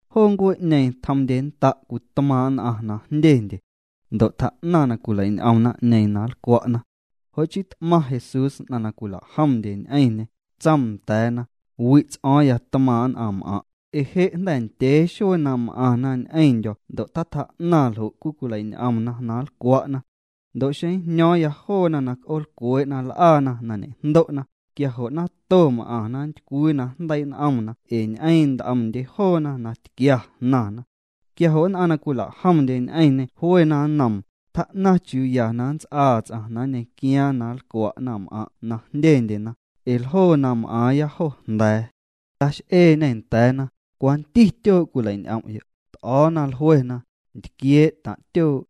Joo ncuee'ñeeⁿ tjomndyennda' cwii tmaaⁿ' nn'aⁿ na jndyendye. Ndo' tjaa'naⁿ na cwileiñ'om naⁿ'ñeeⁿ na nlcwa'na. Jo' chii t'maⁿ Jesús nn'aⁿ na cwila'jomndye ñ'eⁿñê, tsoom nda̱a̱na: —Wi' ts'o̱o̱ⁿya tmaaⁿ' nn'aⁿm'aⁿ', ee je' jnda̱ ndyee xuee na m'aⁿna ñ'eⁿndyo̱ ndo' tatjaa'naⁿ ljo' cwii cwileiñ'omna na nlcwa'na. Ndo' xeⁿ njño̱o̱ⁿya joona na c'oolcwee'na l'aana na ñe'jndo'na, quia jo' nato m'aⁿna nntycwii na jndeii' n'omna ee ñ'eeⁿ nt'omndye joona na tquia jnaⁿna. Quia jo' nn'aⁿ na cwila'jomndye ñ'eⁿñê jluena nnoom: —Tjaa'naⁿ chiuu ya na nnts'aa ts'aⁿ na nñequiaaⁿ na nlcwa' naⁿm'aⁿ' na jndyendyena, ee ljoo na m'aaⁿya jo jnda̱a̱. Tax'eeñê nda̱a̱na: —¿Cwanti tyoo' cwilei'ñ'om'yo'? T'o̱o̱na, jluena: —Ntquiee' taⁿ' tyoo'.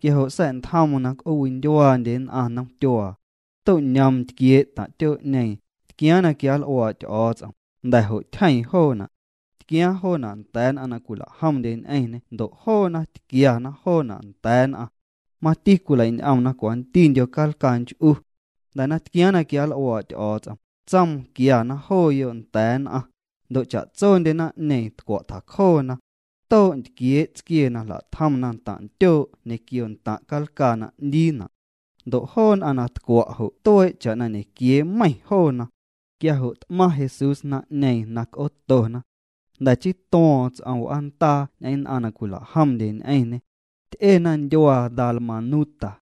Quia jo' sa̱'ntjoom na c'oocwindyuaandye nn'aⁿ nomtyuaa. To'ñoom ntquiee' taⁿ' tyoo'ñeeⁿ, tquiaaⁿ na quianl'uaa' Ty'o̱o̱ts'om, jnda̱ jo' tyjeeⁿ joona'. Tquiaaⁿ joona' nda̱a̱ nn'aⁿ na cwila'jomndye ñ'eⁿñê ndo' joona tquiana joona' nda̱a̱ nn'aⁿ. Mati cwileiñ'omna cwantindyo calcaa nch'u. Jnda̱ na tquiaaⁿ na quianl'uaa' Ty'o̱o̱ts'om, tsoom na quiana jooyo' nda̱a̱ nn'aⁿ. Ndo' cha'tsondye naⁿ'ñeeⁿ tcwa' tjacjoona. Too' ntquiee' tsquiee na jla'tjomna ntaⁿ' ntyoo' ñequio ntaⁿ' calcaa na 'ndiina'. Ndo' joo nn'aⁿ na tcwa' jo' tuee' cha'na ñequiee meiⁿ joona. Quia jo' t'maⁿ Jesús naⁿ'ñeeⁿ na c'ootona. Jnda̱ chii tuo̱o̱ⁿ ts'om w'aandaa ñ'eⁿ nn'aⁿ na cwila'jomndye ñ'eⁿñê. Ty'ena ndyuaa Dalmanuta.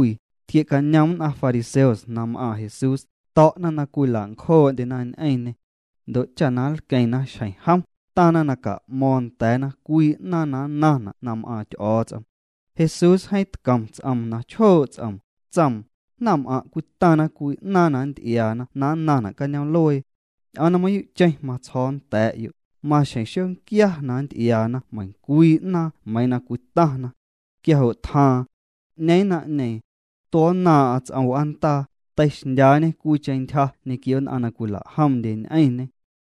Tquie'cañom nn'aⁿ fariseos na m'aaⁿ Jesús, to̱'na na cwila'ncjoo'ndyena ñ'eⁿñê. Ndo' cha na nlqueⁿna xjeⁿ jom, taⁿna na ca'mo̱o̱ⁿ nda̱a̱na cwii 'naaⁿ na nnaⁿna' na m'aaⁿ Ty'o̱o̱ts'om. Jesús jeeⁿ tcom ts'oom na chjoo' ts'oom, tsoom: —Naⁿm'aⁿ' cwitaⁿna cwii 'naaⁿ na nnty'iaana na nnaⁿna' cañoom'luee. Ñ'oom na mayuu'cheⁿ matsjo̱o̱ nda̱a̱'yo', maxjeⁿ xonquia na nnty'iaana meiⁿcwii 'naaⁿ meiiⁿ na cwitaⁿna. Quia jo' tjaaⁿ. 'Ñeeⁿ naⁿ'ñeeⁿ. Tuo̱nnaaⁿ'aⁿ ts'om w'aandaa, teixndyaañê cwiicheⁿ nantyja ñequio nn'aⁿ na cwila'jomndye ñ'eⁿñê.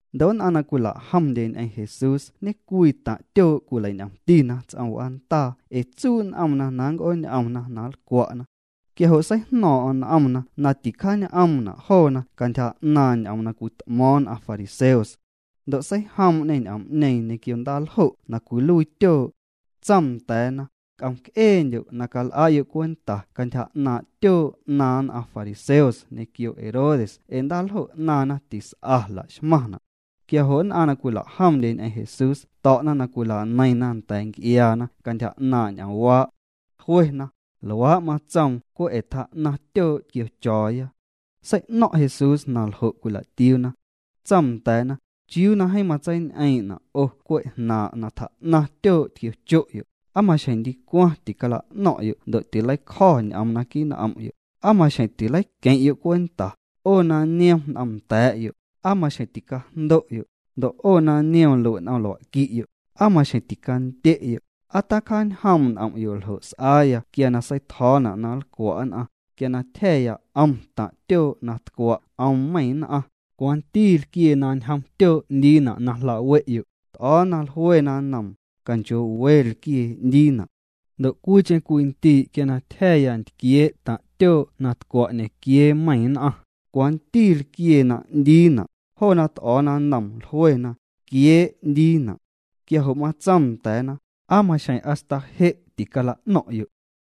Ndo' nn'aⁿ na cwila'jomndye ñ'eⁿ Jesús ñecwii taⁿ' tyoo' cwileiñ'omtina ts'om w'aandaa ee tsuu' n'omna na nnc'ooñ'omna na nlcwa'na. Quia jo' seijno̱o̱ⁿ'o̱ⁿ n'omna na ticjaañ'oomna' joona cantyja 'naaⁿ ñ'oom na cwit'mo̱o̱ⁿ nn'aⁿ fariseos. Ndo' seijoom'ñê ñ'oom'ñeeⁿ ñequio ndaaljo' na cwiluii tyoo'. Tsoom nda̱a̱na: —C'om'c'eendyo' na cal'a'yo' cwenta cantyja 'naaⁿ' tyoo' 'naaⁿ nn'aⁿ fariseos ñequio Herodes ee ndaaljo' 'naaⁿna tis'a laxmaⁿna'. Quia jo' nn'aⁿ na cwila'jomndye ñ'eⁿ Jesús to̱'na na cwilaneiⁿna nda̱a̱ nc'iaana cantyja 'naaⁿ' ñ'oomwaa'. Jluena: —Luaa' matsoom cwe' ee tjaa'naⁿ tyoo' tquiocho̱o̱ya. Sei'no̱ⁿ' Jesús na ljo' cwila'tiuuna. Tsoom nda̱a̱na: —¿Chiuu na jeeⁿ matseiñ'eeⁿ'ñena' 'o cwe' jnaaⁿ' na tjaa'naⁿ tyoo' tquiocho'yo'? ¿Aa maxjeⁿ ndicwaⁿ ticala'no̱ⁿ'yo' ndo' na tileicjo̱ ñ'oom naquii' n'om'yo'? ¿Aa maxjeⁿ tileiqueⁿ'yo' cwenta? 'O na niom n'omnda̱a̱'yo', ¿aa maxjeⁿ ticajndo'yo'? Ndo' 'o na niom lue' n'om lua'qui'yo', ¿aa maxjeⁿ ticandye'yo'? ¿Aa tacjaanjoom' n'om'yo' ljo' s'aaya quia na seitjo̱o̱na' na nlcwa' nn'aⁿ? Quia na tyja̱ya 'om taⁿ' tyoo' na tcwa' 'om meiⁿ nn'aⁿ, ¿cwanti lquiee na ñjom tyoo' 'ndiina' na jla'we'yo'? T'o̱o̱na, jluena nnoom: —Canchoo'we lquiee 'ndiina'. —Ndo' cwiicheⁿ cwii ndii' quia na tyja̱ya ntquiee' taⁿ' tyoo' na tcwa' ñequiee meiⁿ nn'aⁿ, ¿cwanti lquiee na 'ndiina'? Joona t'o̱o̱na nnoom, jluena: —Ntquiee' 'ndiina'. Quia jo' matsoom nda̱a̱na: —¿Aa maxjeⁿ hasta je' ticala'no̱ⁿ'yo'?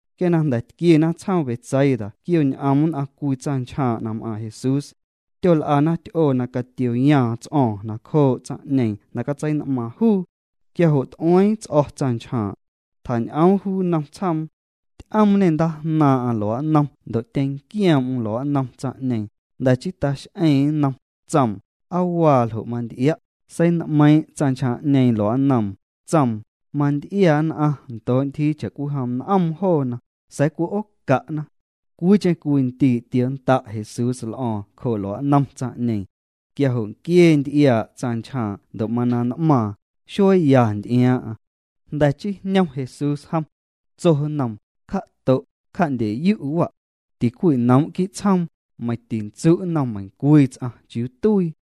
Quia na jnda̱ tquiena tsjoom Betsaida tquioñ'om nn'aⁿ cwii tsaⁿnchjaaⁿ' na m'aaⁿ Jesús. Tyol'ana ty'oo na catioyaaⁿ ts'o̱o̱ⁿ nacjoo' tsaⁿ'ñeeⁿ na catsein'maaⁿ juu. Quia jo' t'ueeⁿ ts'o̱ tsaⁿnchjaaⁿ'. Tjañ'oom juu nnom tsjoom. Ty'oomñê ndaajnaaⁿ'aⁿ lua'nnom ndo' tyenquioom'm lua'nnom tsaⁿ'ñeeⁿ, jnda̱ chii tax'eeⁿ nnom, tsoom: —¿Aa waa ljo' manty'ia'? Sein'meiiⁿ' tsaⁿnchjaaⁿ'ñeeⁿ lua'nnoom, tsoom: —Manty'ia nn'aⁿ ndoo' ntyjii cha'cwijom n'oom joona, sa̱a̱ cwi'ooca'na. Cwiicheⁿ cwii ndii' tionnda' Jesús l'o̱o̱ⁿ cjoo' lua'nnom tsaⁿ'ñeeⁿ. Quia jo' nquiee nty'iaa' tsaⁿnchjaaⁿ' ndo' mana n'maaⁿ, xueeya nty'iaaⁿ'aⁿ. Jnda̱ chii jñom Jesús jom. Tso nnoom: —Cja'to', cja'ndye'yu' wa'. Ticwinoom' quii' tsjoom, meiⁿ tintsu' nnom meiⁿcwii ts'aⁿ chiuu tuii.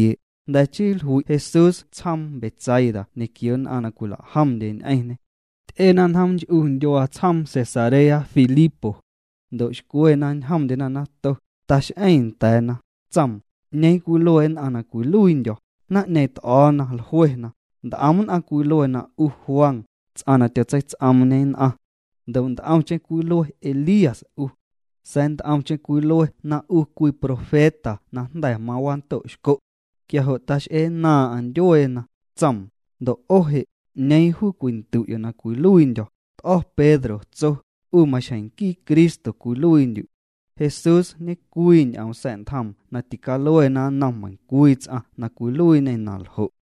Jnda̱ chii jlui' Jesús tsjoom Betsaida ñequio nn'aⁿ na cwila'jomndye ñ'eⁿñê. Ty'ena njoom nch'u ndyuaa tsjoom Cesarea Filipo. Ndo' xcwe na ñjomndyena nato, tax'eeⁿ nda̱a̱na, tsoom: —¿'Ñeeⁿ cwilue nn'aⁿ na cwiluiindyo̱? Naⁿ'ñeeⁿ t'o̱o̱na, jluena: —Nt'om nn'aⁿ cwilue na 'u Juan, ts'aⁿ na tyotseits'oomñe nn'aⁿ. Ndo' nt'omcheⁿ cwilue Elías 'u. Sa̱a̱ nt'omcheⁿ cwilue na 'u cwii profeta na jnda̱ wando'xco'. Quia jo' tax'eennaaⁿ'aⁿ ndyueena, tsoom: —Ndo' 'o je', ¿'ñeeⁿ juu cwindu'yo' na cwiluiindyo̱? T'o̱ Pedro, tso: —'U maxjeⁿ nquii Cristo cwiluiindyu'. Jesús ñecwii ñ'oom sa̱'ntjoom na ticaluena nnom meiⁿcwii ts'aⁿ na cwiluiiñê na ljo'.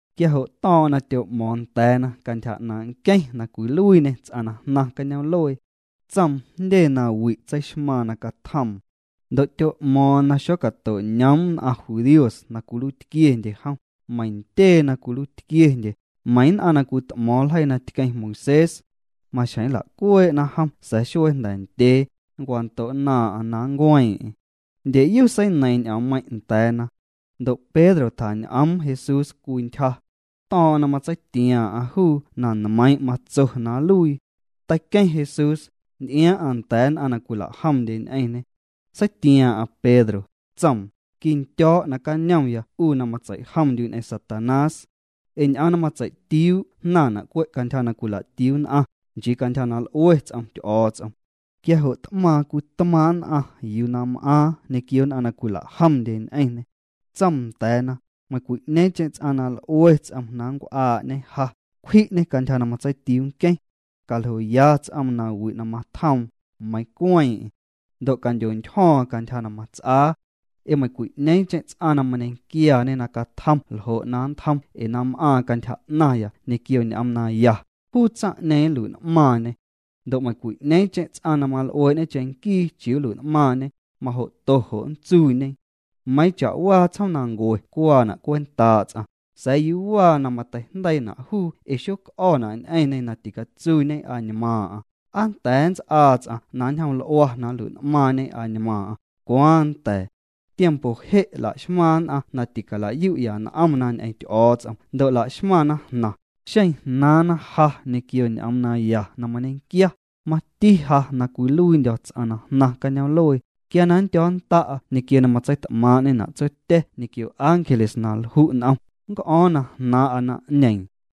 Quia jo' to̱o̱ⁿ'o̱ⁿ na tyo'mo̱o̱ⁿ nda̱a̱na cantyja 'naaⁿ' nqueⁿ na cwiluiiñê ts'aⁿ na jnaⁿ cañoom'luee. Tsoom jndye nawi' tseixmaaⁿ na catjoom. Ndo' tyo'mo̱o̱ⁿ na xocato'ñoom nn'aⁿ judíos na cwiluiitquiendye jom, meiⁿ ntyee na cwiluiitquiendye, meiⁿ nn'aⁿ na cwit'mo̱o̱ⁿ ljeii na tqueⁿ Moisés. Maxjeⁿ nla'cuee'na jom sa̱a̱ xuee jnda̱ ndyee, nncwando'nnaaⁿ'aⁿ na nncueeⁿ'eⁿ. Ndyeyu seineiiⁿ ñ'oommeiⁿ' nda̱a̱na. Ndo' Pedro tjañ'oom Jesús cwii ntyja. To̱o̱ⁿ'o̱ⁿ na matseitiaaⁿ'aⁿ juu na nmeiⁿ' matso na nluii. Teiqueⁿ Jesús, nty'iaaⁿ'aⁿ nda̱a̱ nn'aⁿ na cwila'jomndye ñ'eⁿñê. Seitiaaⁿ'aⁿ Pedro, tsoom: —Quindyo̱o̱' nacañomya 'u na matseijomndyu' ñ'eⁿ Satanás. Ee ñ'oom na matsei'tiuu' jnaⁿna' cwe' cantyja na cwila'tiuu nn'aⁿ, nchii cantyja na l'ue ts'om Ty'o̱o̱ts'om. Quia jo' t'maaⁿ cwii tmaaⁿ' nn'aⁿ yuu na m'aaⁿ ñequio nn'aⁿ na cwila'jomndye ñ'eⁿñê. Tsoom nda̱a̱na: —Meiⁿcwi'ñeeⁿcheⁿ ts'aⁿ na l'ue ts'om na nncw'aa'ñe ja, cwji'ñê cantyja na matseitiuu nqueⁿ. Caljoya ts'oom nawi' na matjoom, meiiⁿ cueeⁿ'eⁿ. Ndo' candyontyjo̱o̱ⁿ cantyja na mats'aa. Ee meiⁿcwi'ñeeⁿcheⁿ ts'aⁿ na mañequiaaⁿñe na catjom ljo' na nntjom ee na m'aaⁿ cantyja 'naⁿya ñequio ñ'oom naya, juu tsaⁿ'ñeeⁿ nlui'n'maaⁿñê. Ndo' meiⁿcwi'ñeeⁿcheⁿ ts'aⁿ na mal'uee'ñe cheⁿnquii chiuu nlui'n'maaⁿñe, majo'to jo' nntsuuñe. Meiiⁿ cha'waa tsjoomnancue cuaana' cwentaa' ts'aⁿ, sa̱a̱ ¿yuu waa na mateijndeiina' juu ee xoc'o̱na' ñ'eⁿñê na ticatsuuñe añmaaⁿ'aⁿ? ¿Aa nnda̱a̱ nnts'aa ts'aⁿ na nnjoml'ua na nlui'n'maaⁿñe añmaaⁿ'aⁿ? Cwaaⁿ nnda̱a̱. Tiempo je' laxmaⁿ nn'aⁿ na ticala'yu'ya n'omna ñ'eⁿ Ty'o̱o̱ts'om ndo' la'xmaⁿna jnaⁿ, xeⁿ jnaaⁿna ja ñequio ñ'oom naya na mañequia, mati ja na cwiluiindyo̱ ts'aⁿ na jnaⁿ cañoom'luee, quia na nndyo̱nnda'a ñequio na matseit'maaⁿ'ñena' Tsotya̱ ñequio ángeles na lju' n'om, nnc'o̱o̱ⁿ na jnaaⁿ'a naⁿ'ñeeⁿ.